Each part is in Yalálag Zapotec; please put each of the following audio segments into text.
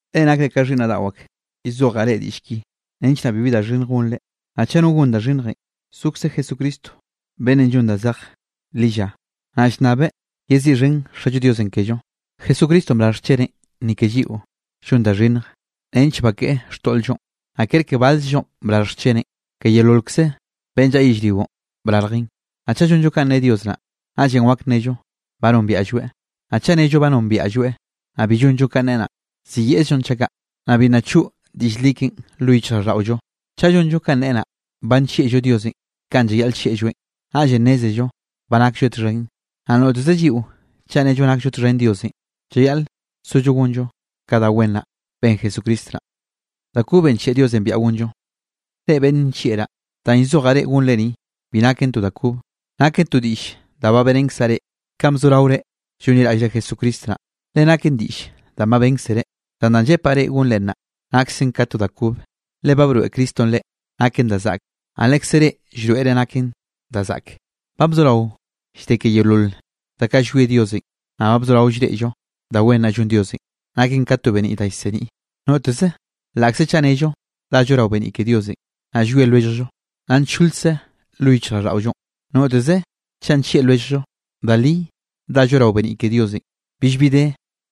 Reꞌ nakre ka xhiꞌnnaꞌ daꞌo ak, llzojaꞌ reꞌ diꞌll ki nench naꞌ bibi da xhinnj gonre. Naꞌ chaꞌ no gon da xhinnjenꞌ, zokze Jesucristo beꞌnnenꞌ llon danꞌ zej lilla, naꞌ llnnabeꞌ yeziꞌxhen Xallo Diosenꞌ kello. Jesucristonꞌ brarj xcheneꞌn ni ke lliꞌo llon da xhinnj nench bakeꞌe xtoꞌl-llonꞌ, naꞌ ker ke balzllonꞌ brarj xcheneꞌn, ke yeololkze beꞌnn llaꞌa yellrionꞌ brarjeꞌn. Naꞌ chaꞌ llonllo kanꞌ ne Dios naꞌ, naꞌllenꞌ wak nnello ba nombiaꞌlloeꞌ. Naꞌ chaꞌ nello ba nombiaꞌlloeꞌ, naꞌ bi llonllo kanꞌ neꞌe naꞌ, ziyeꞌzllonꞌ chaꞌ kaꞌ, naꞌ bi nna choꞌ diꞌll li keꞌen lo yichjraꞌlldaꞌollo. Chaꞌ llonllo kanꞌ neꞌe naꞌ, ba nllieꞌllo Diosenꞌ kanꞌ llayaꞌl llieꞌlloeꞌn. Naꞌllenꞌ nnézello ba naklloeꞌ txhen. Naꞌ noteze lliꞌo chaꞌ nello nakllo txhen Diosenꞌ, llayaꞌl sollo gonllo ka da wen naꞌ ben Jesucristo naꞌ. Reꞌ beꞌnn nllieꞌraꞌ, danꞌ llzojaꞌ reꞌ gonre ni, bi naken to da kobe. Naken to diꞌll da ba beꞌrenkzaꞌ reꞌ kanꞌ bzoraore llonliraꞌllre Jesucristo naꞌ, le naken diꞌll danꞌ ba bénkzere. Zan danꞌ llepaꞌ reꞌ gonre naꞌ, naksen ka to da kobe, le ba broeꞌ Cristonꞌ reꞌ naken da zaꞌke, naꞌ lekze reꞌ llroeꞌre naken da zaꞌke. Ba bzorao llde ke yeolol da kaꞌ llwie Diosenꞌ. Naꞌ ba bzorao llreꞌllo da wen naꞌ llon Diosenꞌ, naken ka to beniꞌ da llseniꞌ. Noteze laꞌkze chaꞌ nnello dallo rao beniꞌ ke Diosenꞌ, naꞌ llwie lwelljllo, nna ncholkze lo yichjraꞌlldaꞌollonꞌ. Noteze chaꞌ nllieꞌ lwelljllo, da li dallo rao beniꞌ ke Diosenꞌ, billbi de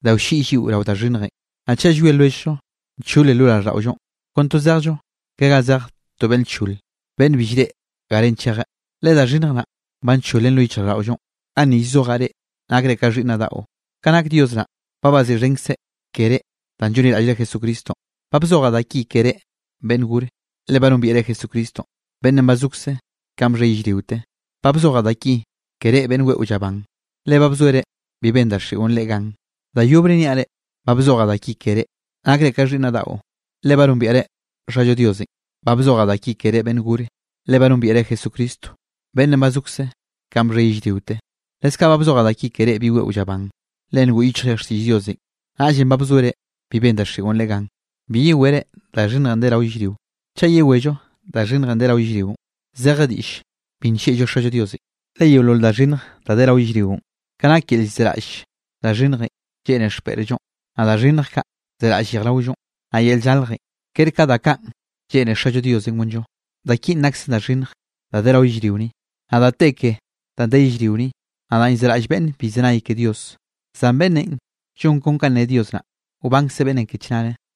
da wlliꞌy lliꞌo rao da xhinnjenꞌ. Naꞌ chaꞌ llwie lwelljllo, nchole lo raꞌlldaꞌollonꞌ, kon to zejllo ka ga zeje to beꞌnne lchol, beꞌnn bi llreꞌe garenꞌ chejeꞌ, le da xhinnj naꞌ ba ncholen lo yichjraꞌlldaꞌollonꞌ. Ganni llzojaꞌ reꞌ nakre ka xhiꞌnnaꞌ daꞌo, ka nak Dios naꞌ, ba baziꞌxhenkzeꞌ keré danꞌ llonliraꞌllre Jesucristonꞌ. Ba bzojaꞌ da ki ke reꞌ beꞌnn gore, le ba nombiaꞌre Jesucristonꞌ beꞌnnenꞌ ba zokze kanꞌ bxhe yellriote. Ba bzojaꞌ da ki ke reꞌ beꞌnn weꞌo llaban, le ba bzoere bi ben daxiꞌo reꞌ gan. Da yobre niaꞌ reꞌ, ba bzojaꞌ da ki ke reꞌ, nakre ka xhiꞌnnaꞌ daꞌo, le ba nombiaꞌre Xallo Diosenꞌ. Ba bzojaꞌ da ki ke reꞌ beꞌnn gore, le ba nombiaꞌre Jesucristo beꞌnnenꞌ ba zokze ka bxhe yellriote. Leskaꞌ ba bzojaꞌ da ki ke reꞌ bi weꞌo llaban, le ngoꞌ yichjre xtiꞌll Diosenꞌ, naꞌllenꞌ ba bzoere bi ben daxiꞌon reꞌ gan. Bi yewere da xhinnjenꞌ de rao yellrionꞌ. Chaꞌ yewello da xhinnjenꞌ de rao yellrionꞌ, zeje diꞌlle bi nllieꞌllo Xallo Diosenꞌ. Le yeolol da xhinnj da de rao yellrionꞌ, ka nak yel zeraꞌll da xhinnjenꞌ lleꞌne xpeꞌrllonꞌ, naꞌ da xhinnj kaꞌ zeraꞌll yejraollonꞌ, naꞌ yel llaljenꞌ, ker ka da kaꞌn lleꞌne Xallo Diosenꞌ gonllo. Da kinꞌ naksen da xhinnj da de rao yellrio ni. Naꞌ da te ke danꞌ de yellrio ni, naꞌ danꞌ llzeraꞌll beꞌnne bi llzenay ke Dios. Zan beꞌnnenꞌ llon kon kanꞌ ne Dios naꞌ, wbankze beꞌnnenꞌ ke chnare.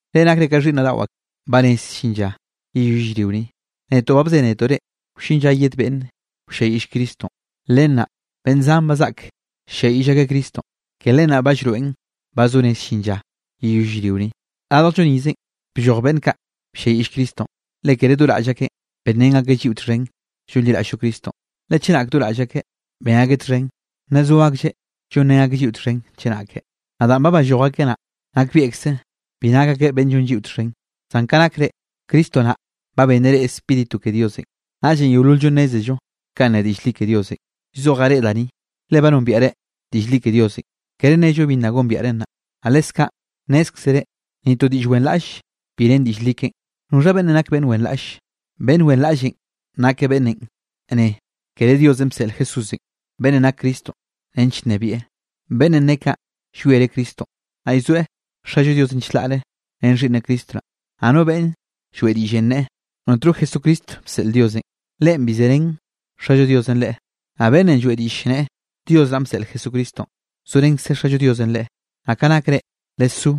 Reꞌ nakre ka xhiꞌnnaꞌ daꞌo ak, ba rez llin lla yeyoll yellrio ni. Netoꞌ ba bzénetoꞌ reꞌ, wllin lla yed beꞌnn wlliayiꞌll Cristonꞌ, le nnaꞌ, beꞌnn zan ba zaꞌk ll-lliayiꞌll akeꞌ Cristonꞌ. Ke len naꞌ ba llroeꞌn ba zo rez llin lla yeyoll yellrio ni. Radjllo nizenꞌ blloj beꞌnn kaꞌ blliayiꞌll Cristonꞌ. Le kere do raꞌll akeꞌn benrén akeꞌ lliꞌo txhen llonliraꞌll-llo Cristonꞌ. Le chenak do raꞌll akeꞌ ben akeꞌ txhen, nna zo aklleꞌ llonrén akeꞌ lliꞌo txhen chenake. Naꞌ danꞌ ba balloj akeꞌ naꞌ, nakbieꞌkze bi nak akeꞌ beꞌnn llon lliꞌo txhen. Zan ka nak reꞌ, Cristo naꞌ ba benneꞌ reꞌ Spíritu ke Diosenꞌ, naꞌllenꞌ yeolol-llo nnézello kanꞌ ne diꞌll li ke Diosenꞌ. Llzojaꞌ reꞌ da ni, le ba nombiaꞌre diꞌll li ke Diosenꞌ, kere nnello bi nna gombiaꞌren naꞌ, naꞌ leskaꞌ nnézkzere ni to diꞌll wenraꞌll bi ren diꞌll li keꞌen. ¿Noxha beꞌnn nak beꞌnn wenraꞌlle? Beꞌnn wenraꞌllenꞌ nak beꞌnnenꞌ nneꞌe kere Diosenꞌ bseꞌl Jesúsenꞌ, beꞌnnenꞌ nak Cristo nench nnebieꞌ. Beꞌnnenꞌ ne kaꞌ llwiereꞌ Cristonꞌ, naꞌ llzoeꞌ Xallo Diosenꞌ chlaꞌre ren Xhiꞌnneꞌ Cristo naꞌ. Naꞌ no beꞌnne lloeꞌ diꞌllenꞌ nneꞌe notno Jesucristo bseꞌl Diosenꞌ, leꞌen bi zerén Xallo Diosenꞌ leꞌe. Naꞌ beꞌnnenꞌ lloeꞌ diꞌll nneꞌe Dios naꞌ bseꞌleꞌ Jesucristonꞌ, zorenkze Xallo Diosenꞌ leꞌe. Naꞌ ka nak reꞌ, lesó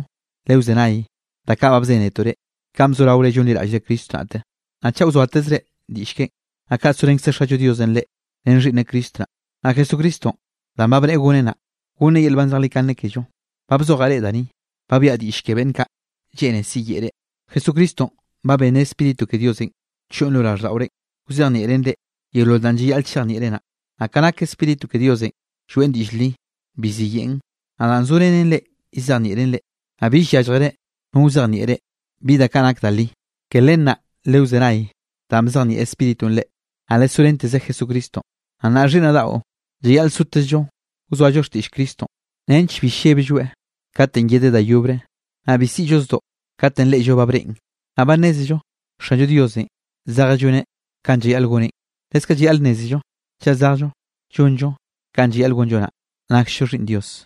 lewzenay ka da kaꞌ ba bzénetoꞌ reꞌ, kanꞌ bzoraore llonliraꞌllre Cristo naꞌte. Naꞌ chaꞌ wzoatezre diꞌll keꞌen, naꞌ kaꞌ sorenkze Xallo Diosenꞌ reꞌ ren Xhiꞌnneꞌ Cristo naꞌ. Naꞌ Jesucristonꞌ, danꞌ ba bneꞌe gonneꞌ naꞌ, gonneꞌ yel nban zejlikane kello. Ba bzojaꞌ reꞌ da ni, ba biaꞌa diꞌll ke beꞌnn kaꞌ lleꞌne siyeꞌe reꞌ. Jesucristonꞌ ba benneꞌ Spíritu ke Diosenꞌ choꞌn lo raꞌlldaꞌorenꞌ, wzejnieꞌreꞌn reꞌ yeolol danꞌ llayaꞌl chejnieꞌre naꞌ. Naꞌ ka nak Spíritu ke Diosenꞌ lloeꞌn diꞌll li, bi ziyeꞌn. Naꞌ danꞌ zorenen reꞌ llzejnieꞌreꞌn reꞌ, naꞌ bill yálljere no wzejnieꞌ reꞌ bi da kaꞌ nak da li. Ke len naꞌ lewzenay danꞌ bzejnieꞌ Spíritunꞌ reꞌ, naꞌ lesorenteze Jesucristonꞌ. Naꞌ nnaꞌ xhiꞌnnaꞌ daꞌo, llayaꞌl sotezllo wzoallo xtiꞌll Cristonꞌ nench bi lleblloeꞌ katenꞌ yedeꞌ da yobre, naꞌ bi siꞌllo zdoꞌ katenꞌ reꞌllo ba breꞌen. Naꞌ ba nnézello Xanllo Diosenꞌ zejeꞌ lloneꞌ kanꞌ llayaꞌl goneꞌn, leskaꞌ llayaꞌl nnézello chaꞌ zejllo llonllo kanꞌ llayaꞌl gonllo naꞌ, naksllo xhiꞌnn Dios.